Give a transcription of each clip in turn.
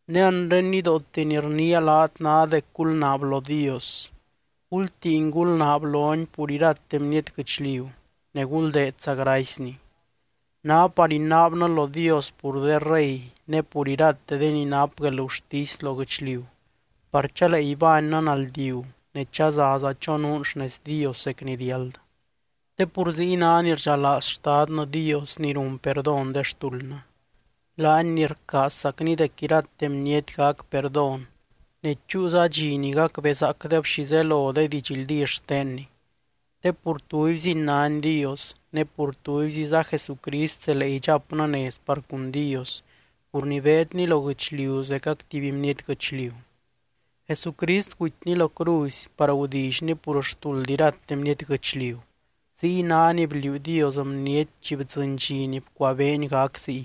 Ne anre nidoote ni rniia laat ná dec gulnaab lo Dios, gultiin gulnaab lony pur irate bniety guɨchliu, ne guldeedza gracyny. Ná par inaabnɨ lo Dios pur de rey ne pur irate de ni nap guelgurtisy lo guɨchliu par chalee ibánnɨ naldiu ne chazaza chonuun xnez Dios zec ni riáld. Te pur ziy ná ni rdxalaaz Xtadnɨ Dios ni run perdón de xtuldnɨ, laany ni rcaazzacny dec irate bniety gac perdón ne chúuza dxi ni gacbezaacdeb xi zelo de didxldí xtenny. Te pur tubyziny nány Dios, ne pur tubyziza Jesucrist zelee idxapnɨ nez par cun Dios pur ni beedny lo guɨchliu zecac tuby bniety guɨchliu. Jesucrist gutyny lo cruzy par gudillyny pur xtuld irate bniety guɨchliu, ziy ná ni bliuu Dios bniety chi bdzɨny dxi ni bcuabeeny gac ziy.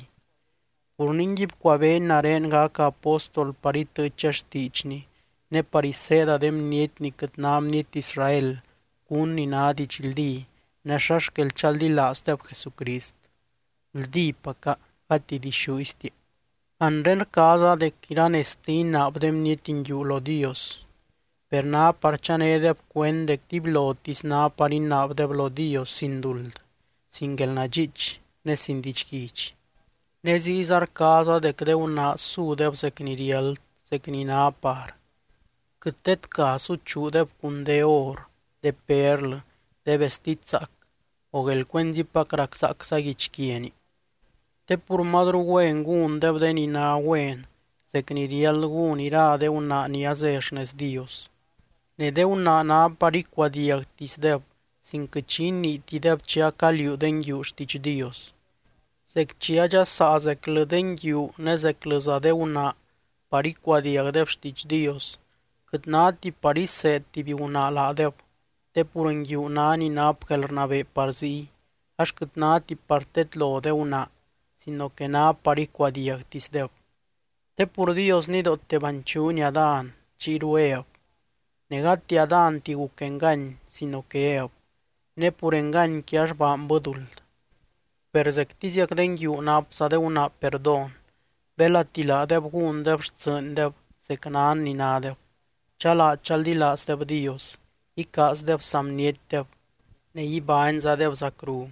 Pur ningui bcuabeeny nare gaca apóstol par itɨɨcha xtiidxny, ne par iseeda de bniety ni quɨt ná bniety Israel cún ni ná didxldí, ne xa xquel chaldilaazdeb Jesucrist. (Guldípaca, gati dixúiztia.) Anre rcaaza dec iranezte inaab de bniety nguiu lo Dios, per ná par chanédeb cuend dec dibylotisy ná par inaabdeb lo Dios sin duld, sin guelnadxiich ne sin didxguidx. Ne ziyza rcaaza dec de gunaa sudeb zec ni riáld, zec ni ná par. Quɨt tedca suchuudeb cun de or, de perlɨ, de vestid zaac, o guelcuenzipac raczaacza guichquiani. Te pur mazru güen gúndeb de ni ná güen, zec ni riáld gún ira de gunaa ni azé xnez Dios. Ne de gunaa ná par icuadiagtisdeb sin quɨt xi iniitideb chi acaliuu de nguiu xtiidx Dios. Zec chi adxasaa zeclɨ de nguiu ne zeclɨza de gunaa par icuadiagdeb xtiidx Dios, quɨt náti par iseed tuby gunaa laadeb te pur nguiu ná ni nap guelrnabee par ziy, ax quɨt náti par tedlo de gunaa sino que ná par icuadiagtisdeb. Te pur Dios nidoote banchuuny Adán, chiyru Ev. Ne gati Adánti guc engany sino que Ev, ne pur enganyqui ax baanbɨ duld. Per zectiziac de nguiu napza de gunaa perdón belati laadeb gúndeb xtsɨɨndeb zec nan ni nádeb, chalaa chaldilaazdeb Dios, icaazdeb saa bnietdeb, ne ibányzadeb zacru.